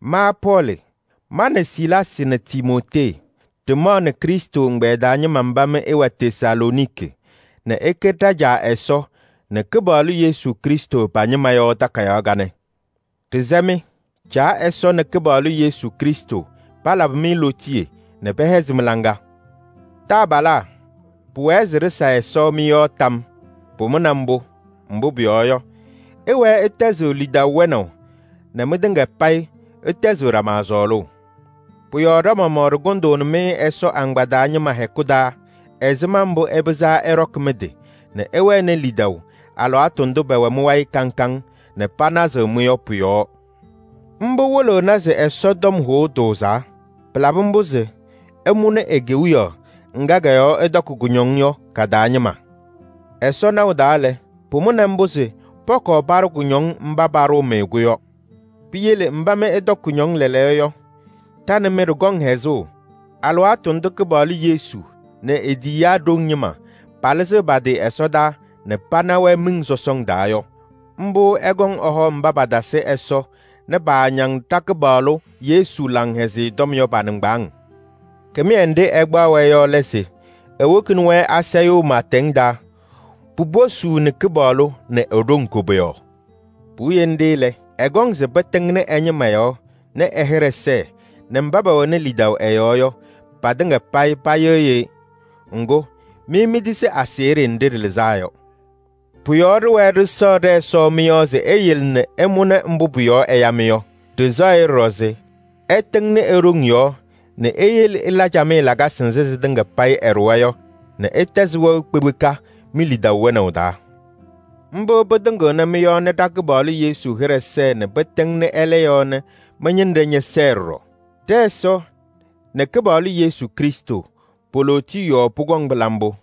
Ma Pɔɔlɩ, ma nɛ Silaasɩ nɛ Timootee ɖɩmaɣnɩ Krɩstʋ ɛgbɛyɛ taa ñɩma mba mɩ ɩwɛ Tesalooniki nɛ ɩkɛ ɖa-Caa Ɛsɔ nɛ Kɩpaɣlʋ Yesu Krɩstʋ pa-ñɩma yɔ takayaɣ kanɛ. Ɖɩsɛ-mɩ: Caa Ɛsɔ nɛ Kɩpaɣlʋ Yesu Krɩstʋ palabɩ-mɩ lootiye nɛ pɛhɛzɩ mɩ-laŋa. Taabalaa! Pʋwɛɛ se ɖɩsa Ɛsɔ mɩ-yɔɔ tam. Pʋmʋna mbʋ, mbʋ pʋyɔɔ yɔ, ɩwɛɛ ɩtɛzɩɣ lidaʋ wɛnaʋ nɛ mɩtɩŋa payɩ ɩtɛzɩɣ ɖama sɔɔlʋʋ. Pʋ-yɔɔ ɖa-maɣmaɣ ɖɩkʋndʋʋnɩ-mɩ Ɛsɔ agbaa taa ñɩma hɛkʋ taa ɛzɩma mbʋ ɩpɩzaa ɩɖɔkɩ mɩ-tɩ nɛ ɩwɛnɩ lidaʋ alɩwaatʋ ndʋ pɛwɛ mɩ-wayɩ kaŋ kaŋ nɛ panazɩɣ-mɩ yɔ pʋ-yɔɔ. Mbʋ wɩlɩɣnɩ se Ɛsɔ tɔm hʋʋ tʋʋzaa. Pɩlabɩ mbʋ se ɩmʋnɩ e-Kewiyaɣ ŋga kɔ-yɔɔ ɩtɔkɩ kʋñɔŋ yɔ ka-taa ñɩma. Ɛsɔ naʋ taa lɛ, pʋmʋna mbʋ se pɔkɔɔ paɖʋ kʋñɔŋ mba paɖʋʋ-mɩ-kʋ yɔ. Piyele mba mɩ ɩtɔkɩ kʋñɔŋ lɛɛlɛɛyɔ yɔ, ɖa nɛ mɩ ɖɩkɔŋ hɛzʋʋ alɩwaatʋ ndʋ Kɩpaɣlʋ Yesu nɛ e-tiyiyaa ɖoŋ ñɩma palɩzɩɣ pa-tɩ ɛsɔdaa nɛ pana-wɛ miɖeɖeŋ taa yɔ. Mbʋ ɛkɔŋ se ɛhɔ mba patasɩ Ɛsɔ nɛ paañaŋ ɖa-Kɩpaɣlʋ Yesu Laŋhɛzɩyɛ Tɔm yɔ pa-nɩŋgbaaŋ. Kɩmɩyɛ nɖɩ ɛkpaɣ-wɛ yɔ lɛ se ewokini-wɛ asayʋʋ pɩɩtɛŋ taa, puposuuni Kɩpaɣlʋ nɛ e-ɖoŋ koboyaɣ. Puwiye nɖɩ lɛ, ɛkɔŋ se pɩtɩŋnɩ ɛ-ñɩma yɔɔ nɛ ɛ-hɩɖɛ sɛɛ nɛ mba pɛwɛnɩ lidaʋ ɛ-yɔɔ yɔ, patɩŋa payɩ payɩɣyɩ-ɩ. Ŋgʋ, mɩ mitisi aseɣɖe nɖɩ ɖɩlɩzaa yɔ. Pʋ-yɔɔ ɖɩwɛɛ ɖɩsɛɣ ɖɛ-Ɛsɔ mɩ-yɔɔ se eyele nɛ ɩmʋnɩ mbʋ pʋ-yɔɔ ɛya-mɩ yɔ. Ɖɩsɛɣ-ɩ ɖɔɖɔ se ɛtɩŋnɩ e-ɖoŋ yɔɔ nɛ eyele ɩla camɩyɛ lakasɩ nzɩ sɩtɩŋa payɩ ɩɖʋwa yɔ nɛ ɩtɛzɩ wɛʋ kpekpeka mi-lidaʋ wɛnaʋ taa. Mbʋ pɩtɩŋɩɣnɩ mɩ-yɔɔ nɛ ɖa-Kɩpaɣlʋ Yesu hɩɖɛ sɛɛ nɛ pɩtɩŋnɩ ɛlɛ yɔɔ nɛ mɩ-ñɩnɖɛ ñɛsɛɛ ɖɔɖɔ. Ɖɛ-Ɛsɔ nɛ Kɩpaɣlʋ Yesu Krɩstʋ, po-lootiye yɔɔ pʋkɔŋ pɩla mbʋ.